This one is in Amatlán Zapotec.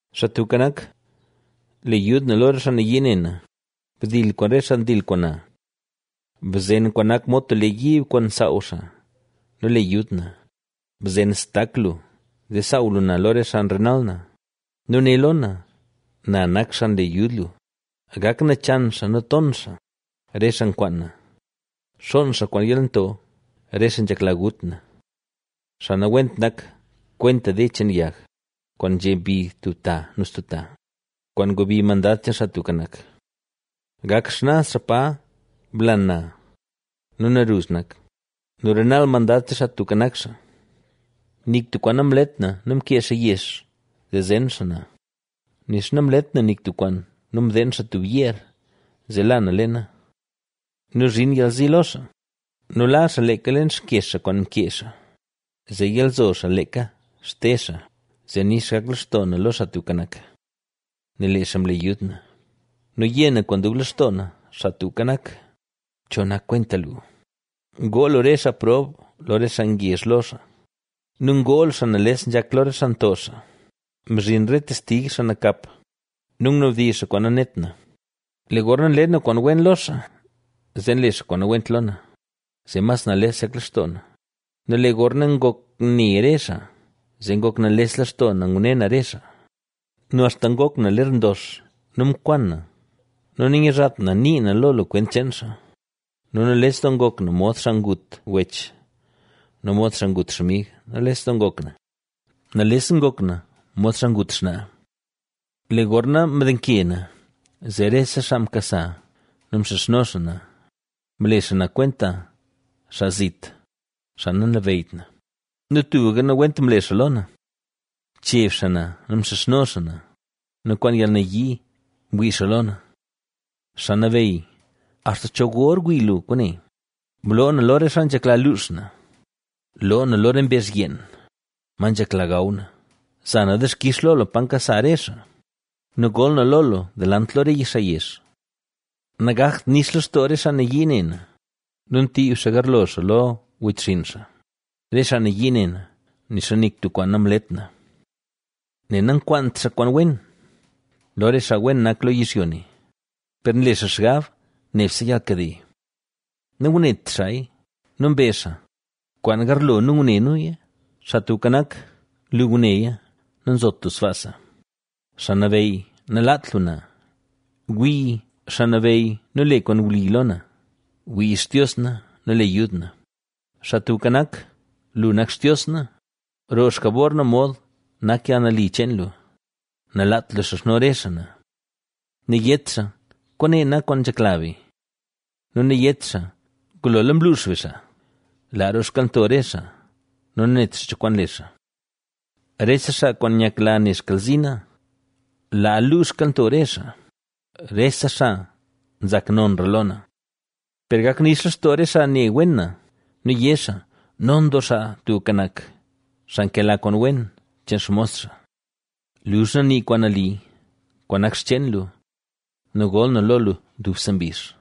Xaa Tubka Nak, le yud na lo re xaa nayii ne na, bdil kwaan re xaa ndil kwaan na. Bzen kwaan nak mod tub lee yiib kwaan saaw xaa nu le yud na; bzen xtak lu zee saaw lu na lo re xaa nrenal na nu né lo na: “¡Na nak xaa nle yud lu!” Gak nachan xaa nu ton xaa, re xaa nkwaan na, xoon xaa kwaan yalnto, re xaa nzhekla gut na. Xaa nawent nak kwenta de cheen yag, kwaan nzhe mbi tub ta nu stub ta, kwaan ngubi Mandad cheen Xaa Tubka Nak. ¡Gak xnaz xaa pa blan na nu naruzh nak nu renal Mandad cheen Xaa Tubka Nak xaa! Nik tub kwaan namlet na nu mkee xaa yex zee zen xaa na, nixa namlet na nik tub kwaan nu mdeen xaa tub yeer zee la na leena. ¡Nu zhin yalzi lo xaa! ¡Nu la xaa leeka leen xkyex xaa kwaan mkee xaa! ¡Zee yalzo xaa leeka xte xaa! Zee nix gak lextoo na lo Xaa Tubka Nak, nel lee xaa mle yud na. Nu yé na kwaan dub lextoo na: “Xaa Tubka Nak, ¿cho nak kwenta lu? Ngoo lu re xaa prob lo re xaa ngezh lo xaa nu ngoo lu xaa nales nzhak lo re xaa nto xaa.” Mzhin re testig xaa nakap nu ngunabdizh xaa kwaan nanet na. Lee gorna nle na kwaan wen lo xaa, zee nle xaa kwaan nawent lo na, zee mas nales nzhak lextoo na; nu lee gorna ngok ne re xaa, zee ngok nales lextoo na ngune na re xaa nu axta ngok na ler ndox nu mkwan na nu nanyizhat na nii na lo lu kwent cheen xaa. Nu nales doo ngok na mod xaa ngut wech, nu mod xaa ngut xmig, nales ngok na; nales ngok na, mod xaa ngut xnaa. Lee gorna mdenke na, zee rese xaa mkasa nu mxizhno xaa na; mle xaa na kwenta xaa zit, xaa nalabeyyt na nu tubka nawent mle xaa lo na. Mcheb xaa na nu mxizhno xaa na nu kwaan yalnayii mwii xaa lo na. Xaa Nabeyy, ¿axta cho gor wii lu kwaane? ¡Bloo na lo re xaa nzhekla luux na, loo na lo re mbezh yeen, ma nzhekla gaw na! Za na dixkix lo lu pa nkasa re xaa nu gol na lo lu delant lo re xaa yezh. Nagakt nix lextoo re xaa nayii ne na nu ntiib xaa garlo xaa lo wechxinn xaa, re xaa nayii ne na, nixa nik tub kwaan namlet na. Nel nankwaant xaa kwaan wen lo re xaa wen nak lo yizhyo ne, per nle xaa xgab nebse yalnkade. Nangunet xaaya nu mbezh xaa: “¡Kwaan garlo nu ngune nuya!” ¡Xaa Tubka Nak, lu nguneya! ¡Nazot lu sbaasa! ¡Xaa Nabeyy, nalaat lu na! ¡Wii, Xaa Nabeyy nu le kwaan wli lo na! ¡Wii Xtios na nu le yud na! Xaa Tubka Nak, lu nak Xtios na, roo xjabor na mod nak yalnali cheen lu, nalaat lu xizhno re xaa na. Nayét xaa: “Kwaane nak kwaan nzhekla be”. Nu nayét xaa: “¡Ngulola mluux be xaa!” Laa roo xkalnto re xaa nu nanet xaa cho kwaan le xaa, rese xaa kwaan nyakla ne xkalzi na; laa luu xkalnto re xaa, rese xaa nzak nonra lo na. Per gak nix lextoo re xaa ne wen na, nu yé xaa: “¡Non doo Xaa Tubka Nak, xaa nkela kwaan wen cheen xmos xaa!” Luzh na nii kwaan nali, kwaan nak xcheen lu nu gol na lo lu dubse mbizh.